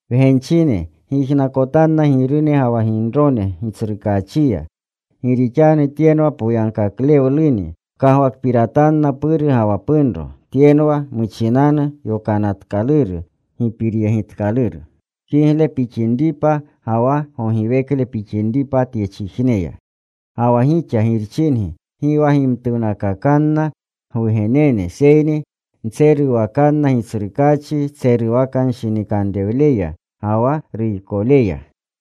Wgenchine, gyijnakotanna girune ga wa ginrone Gitsrukaachiya. Gi rixanu tyenwa poyagkaklewluni. Pkagwakpiratanna puru ga wa punro. Tyenwa muchinanu yokanatkaluru gipiryegitkaluru. Kigle pixinripa, ga wa gogiwekle pixinripa tyechijneya. Ga wa gixa girchingi, gi wa gimtuwnakakanna gwugenene, seyni ntseruwakanna Gitsrukaachi tseruwakanshinikanrewleya ga wa ruykoleya.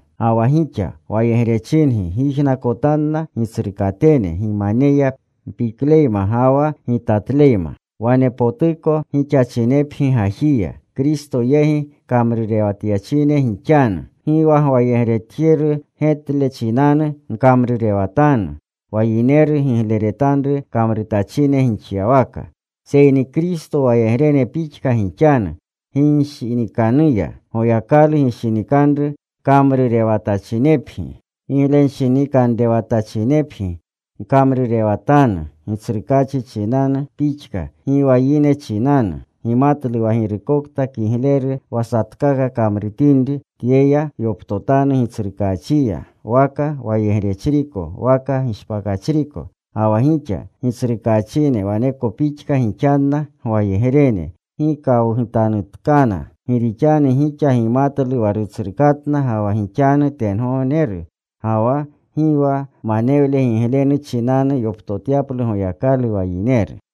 Ga wa gixa wayegrechingi gyijnakotanna gitsrukatene gimaneya mpikleyma ga wa gitatleyma. Wanepotuko gixachinepgi gajiya. Kristo yegi kamrurewatyachine gixanu. Gi wa gwayegretjeru getle chinanu gkamrurewatanu, wa yineru gigleretanru kamrutachine gixyawaka. Seyni Kristo wayegrene pixka gixanu. Ginshinikanuya Goyakalu gishinikanru kamrurewatachinepgi. Giglenshinikanrewatachinepgi, gkamrurewatanu Gitsrukaachi chinanu pixka, gi wa yine chinanu. Gimatlu wa girukokta kigleru wa satkaka kamrutinri, tyeya yoptotanu Gitsrukaachiya, waka wayegrechriko waka gishpakachriko. Ga wa gixa gitsrukaachine, waneko pixka gixanna gwayegrene. Gi kawgutanutkana. Gi rixanu gixa gimatlu wa Rutsrukatna ga wa gixanu tengogneru. Ga wa gi wa manewle giglenu chinanu yoptotyaplu Goyakalu wa yineru.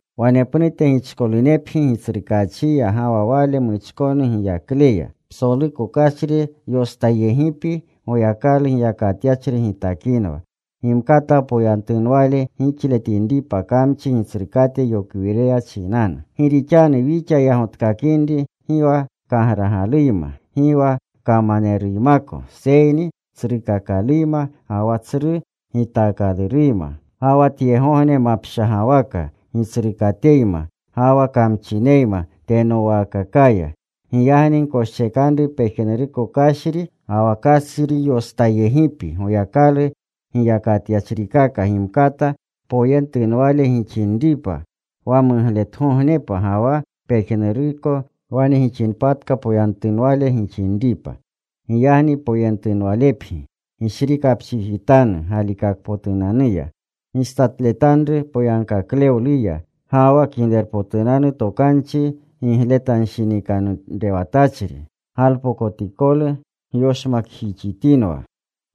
Wanepnute gichkolunepgi Gitsrukaachiya ga wa Wale muchkonu giyakleya. Psoluko kashri yostayegipi Goyakalu giyakatyachri gitakinwa. Gimkata poyentunwale gixletinripa kamchi gitsrukate yokwireya chinanu. Gi rixanu wixa yagotkakinri gi wa kagragaluyma, gi wa kamaneruymako. Seyni tsrukakaluyma, ga wa tsru gitaakaluyma, ga wa tyegogne mapshagawaka gitsrukateneyma, ga wa kamchineyma tenowaakakaya. Giyagni gkoschekanru pejnuruko kashri ga wa kashri yostayegipi Goyakalu giyakatyachrikaka, gimkata poyentunwale gixinripa wa mugletgognepa. Ga wa pejnuruko wane gixinpatka poyentunwale gixinripa. Giyagni poyentunwalepgi. Gishrikapchijitanu galikakpotunanuya. Gistatletanru poyagkaklewluya. Ga wa Kiglerpotunanu Tokanchi gigletanshinikanrewatachri galpokotikolu gyoshmakjixitinwa.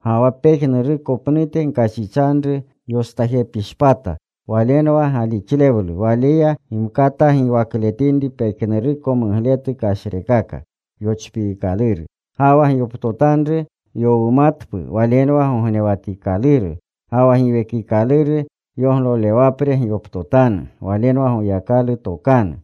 Ga wa pejnuruko pnute, gkashichanru yostayegipishpata. Walenwa galixlewlu. Waleya gimkata giwakletinri pejnuruko mugletu kashrekaka yochpiikaluru. Ga wa gyoptotanru yowumatpu. Walenwa gognewatikaluru. Ga wa Giwekikaluru yoglolewapre gyoptotanu. Walenwa Goyakalu tokanu.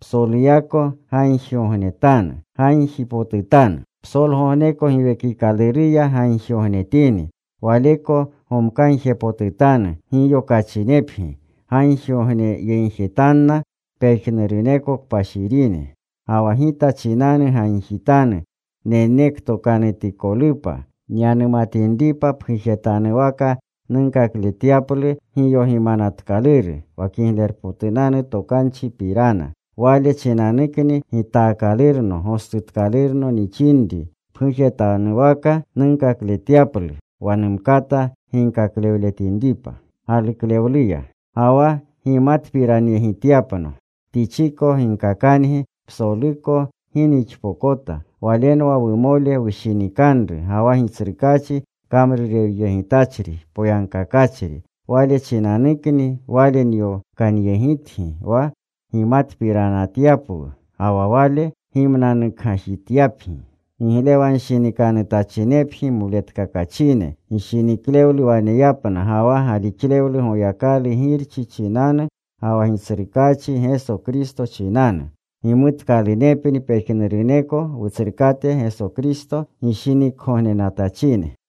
Psoluyako gagjigognetanu. Gagjipotutanu. Psolgogneko Giwekikaluruya gagjigognetini. Waleko gomkagjepotutanu giyokachinepgi. Gagjigogneyegjetanna pejnuruneko kpashirine. Ga wa gita chinanu gagjitanu, nenektokanutikolupa nyanumatinripa, pgujetanuwaka nunkakletyaplu giyogimanatkaluru wa Kiglerpotunanu Tokanchipirana. Wale chinanukni gitaakalurno, gostutkalurno nixinri, pgujetanuwaka nunkakletyaplu, wa numkata ginkaklewletinripa. Ga wa gimatpiranyegityapno, Tichiko ginkakangi psoluko gi nixpokota. Walenwa wumole wushinikanru, ga wa Gitsrukaachi kamrurewyegitachri poyagkakachri. Wale chinanukni wale nyokanyegitgi, wa gimatpiranyegityapwu, ga wa wale gimnanukgajityapgi. Giglewanshinikanutachinepni moletkakachine. Gishiniklewlu waneyapna ga wa galixlewlu Goyakalu Girchi chinanu ga wa Gitsrukaachi Geso Kristo chinanu. Gimutkalunepni pejnuruneko Wutsrukate Geso Kristo gishinikgognenatachine.